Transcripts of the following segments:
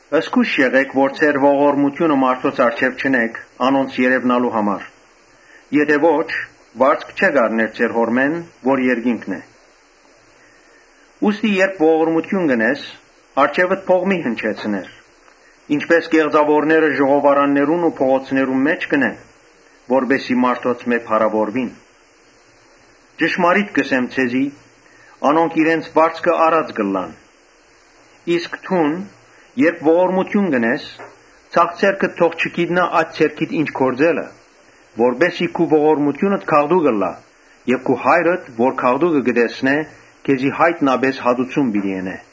«Զգոյշ եղէք որ ձեր ողորմութիւնը մարդոց առջեւ չընէք՝ անոնց երեւնալու համար, եթէ ոչ՝ վարձք չէք առներ ձեր Հօրմէն որ երկինքն է։ Ուստի երբ ողորմութիւն կ’ընես, առջեւդ փող մի՛ հնչեցներ, ինչպէս կեղծաւորները ժողովարաններուն ու փողոցներուն մէջ կ’ընեն, որպէս զի մարդոցմէ փառաւորուին. ճշմարիտ կ’ըսեմ քեզի. ‘Անոնք իրենց վարձքը առած կ’ըլլան’։ Իսկ դուն երբ ողորմութիւն կ’ընես, ձախ ձեռքդ թող չգիտնայ աջ ձեռքիդ ինչ տալը, Որպէս զի քու ողորմութիւնդ գաղտուկ ըլլայ եւ քու Հայրդ որ գաղտուկը կը տեսնէ, քեզի յայտնապէս հատուցում պիտի ընէ։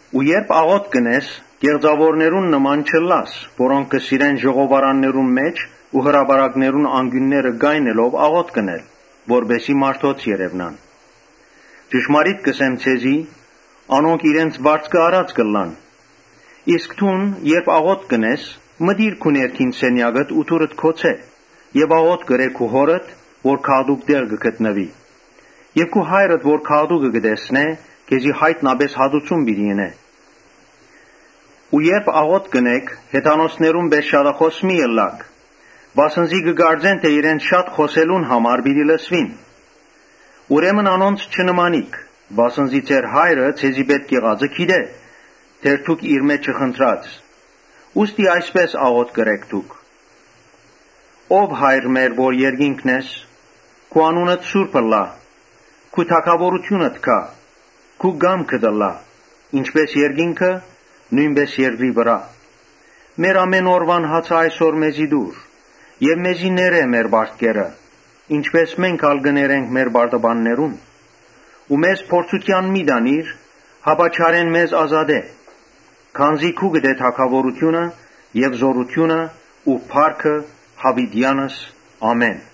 Ու երբ աղօթք կ’ընես, կեղծաւորներուն նման մի՛ ըլլար, որոնք կը սիրեն ժողովարաններուն մէջ ու հրապարակներուն անկիւնները կայնելով աղօթք ընել, որպէս զի մարդոց երեւնան. ճշմարիտ կ’ըսեմ ձեզի, Անոնք իրենց վարձքը առած կ’ըլլան։ Իսկ դուն երբ աղօթք կ’ընես, մտիր քու ներքին սենեակդ ու դուռդ գոցէ եւ աղօթք ըրէ քու Հօրդ որ գաղտուկ տեղ կը գտնուի եւ քու հայրդ որ գաղտուկը կը տեսնէ, քեզի յայտնապէս հատուցում պիտի ընէ։ Երբ աղօթք կ’ընէք, հեթանոսներուն պէս շատախօս մի՛ ըլլաք, վասն զի կը կարծեն թէ իրենց շատ խօսելուն համար պիտի լսուին։ Ուրեմն անոնց մի՛ նմանիք, վասն զի ձեր Հայրը ձեզի պէտք եղածը գիտէ՝ դեռ դուք իրմէ չխնդրած»։ Ուստի այսպէս աղօթք ըրէք դուք. «Ով Հայր մեր որ երկինքն ես, քու անունդ սուրբ ըլլայ. Քու թագաւորութիւնդ գայ. քու կամքդ ըլլայ ինչպէս երկինքը՝ նոյնպէս երկրի վրայ. Մեր ամէն օրուան հացը այսօր ալ մեզի տուր, Մեզի ներէ մեր պարտքերը ինչպէս մենք ալ կը ներենք մեր պարտականներուն. Ու մեզ փորձութեան մի տանիր, հապա չարէն մեզ ազատէ. քանզի քուկդ է թագաւորութիւնը եւ զօրութիւնը ու փառքը յաւիտեանս։ Ամէն»։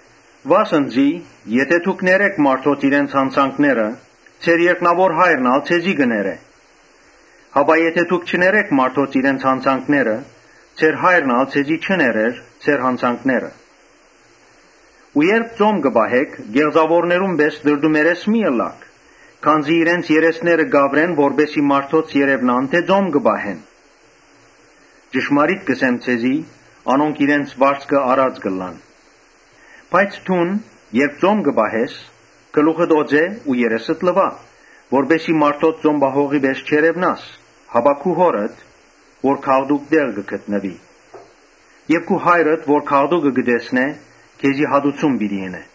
«Վասն զի եթէ դուք ներէք մարդոց իրենց յանցանքները, ձեր երկնաւոր Հայրն ալ ձեզի պիտի ներէ. Իսկ եթէ դուք չներէք մարդոց իրենց յանցանքները, ձեր Հայրն ալ ձեզի պիտի չներէ ձեր յանցանքները»։ «Երբ ծոմ կը պահէք, կեղծաւորներուն պէս տրտումերես մի՛ ըլլաք. քանզի իրենց երեսները կ’աւրեն որպէս զի մարդոց երեւնան թէ ծոմ կը պահեն. ճշմարիտ կ’ըսեմ ձեզի. ‘Անոնք իրենց վարձքը առած կ’ըլլան’։ Բայց դուն երբ ծոմ կը պահես, գլուխդ օծէ ու երեսդ լուա, Որպէս զի մարդոց ծոմ պահողի պէս չերեւնաս, հապա քու Հօրդ՝ որ գաղտուկ տեղ կը գտնուի։ Քու հայրդ որ գաղտուկը կը տեսնէ, Ոմանք, քեզի յայտնապէսքեզի հատուցում պիտի ընէ»։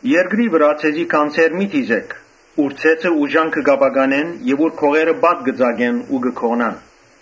Երկրի վրայ ձեզի գանձեր մի դիզէք, ուր ցեցը ու ժանգը կ’ապականեն, ուր գողերը պատ կը ծակեն ու կը գողնան.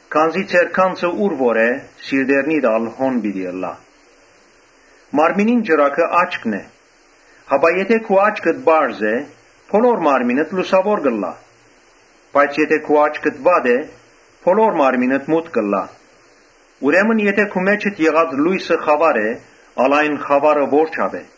Քանզի ձեր գանձը ուր որ է, սրտերնիդ ալ հոն պիտի ըլլայ։ Մարմնին ճրագը աչքն է, ուրեմն եթէ քու աչքդ պարզ է, բոլոր մարմինդ լուսաւոր կ’ըլլայ։ Բայց եթէ քու աչքդ վատ է, բոլոր մարմինդ մութ կ’ըլլայ. ուրեմն եթէ քու մէջդ եղած լոյսը խաւար է, ալ այն խաւարը ո՜րչափ է։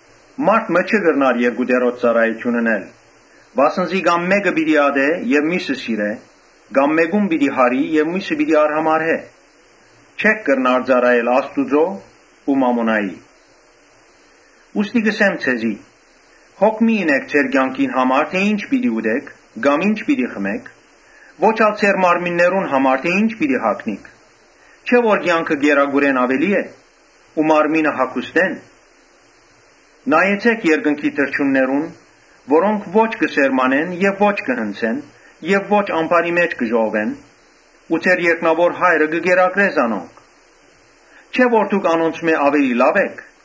Մարդ մը չի կրնար երկու տիրոջ ծառայութիւն ընել. վասն զի կա՛մ մէկը պիտի ատէ եւ միւսը սիրէ, կա՛մ Կամ, մէկը պիտի մեծարէմէկուն պիտի յարի՝ ՝ եւ միւսը պիտի արհամարհէ. չէք կրնար ծառայել Աստուծոյ ու մամոնային։ Ուստի կ’ըսեմ ձեզի. «Հոգ մի՛ ընէք ձեր կեանքին համար թէ ի՛նչ պիտի ուտէք, կամ ի՛նչ պիտի խմէք. ոչ ալ ձեր մարմիններուն համար թէ ի՛նչ պիտի հագնիք. չէ՞ որ կեանքը կերակուրէն աւելի է ու մարմինը հագուստէն։ Նայեցէք երկնքի թռչուններուն, որոնք ո՛չ կը սերմանեն եւ ո՛չ կը հնձեն, ո՛չ ամբարի մէջ կը ժողվեն, բայց ձեր երկնաւոր Հայրը կը կերակրէ զանոնք։ Չէ՞ որ դուք անոնցմէ լաւ էք։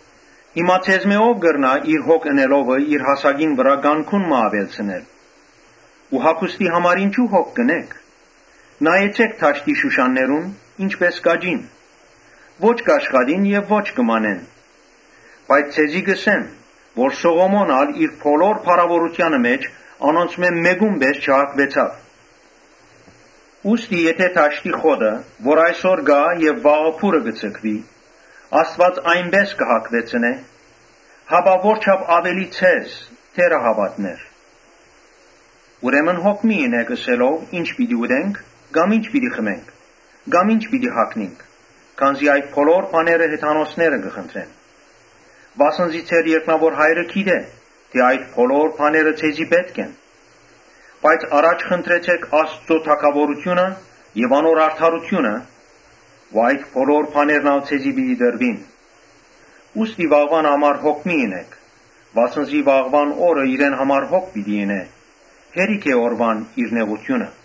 Հիմա ձեզմէ ո՞վ կրնայ իր հոգ ընելովը իր հասակին վրայ կանգուն մը աւելցնել։ Ու հագուստի համար ինչո՞ւ հոգ կ’ընէք. նայեցէք դաշտի շուշաններուն, ի՞նչպէս կ’աճին։ Ո՛չ կ’աշխատին եւ ո՛չ կը մանեն. Բայց ձեզի կ’ըսեմ թէ Սողոմոն ալ իր բոլոր փառաւորութեանը մէջ անոնցմէ մէկո՛ւն պէս չհագուեցաւ։ Ուստի եթէ դաշտի խոտը, որ այսօր կայ եւ վաղը փուռը կը ձգուի, Աստուած այնպէս կը հագուեցնէ, հապա որչա՜փ աւելի ձեզ, թե՛րահաւատներ։ Ուրեմն հոգ մի՛ ընէք՝ ըսելով. ‘Ի՞նչ պիտի ուտենք, կամ ի՞նչ պիտի հագնինք’։ (Քանզի այդ բոլոր բաները հեթանոսները կը խնդրեն). վասն զի ձեր երկնաւոր Հայրը գիտէ՝ թէ այդ բոլոր բաները ձեզի պէտք են։ Բայց առաջ խնդրեցէք Աստուծոյ թագաւորութիւնը եւ անոր արդարութիւնը ու այդ բոլոր բաներն ալ ձեզի պիտի տրուին։ Ուստի վաղուան համար հոգ մի ընէք, վասն զի վաղուան օրը իրեն համար հոգ պիտի ընէ. հերիք է օրուան իր նեղութիւնը»։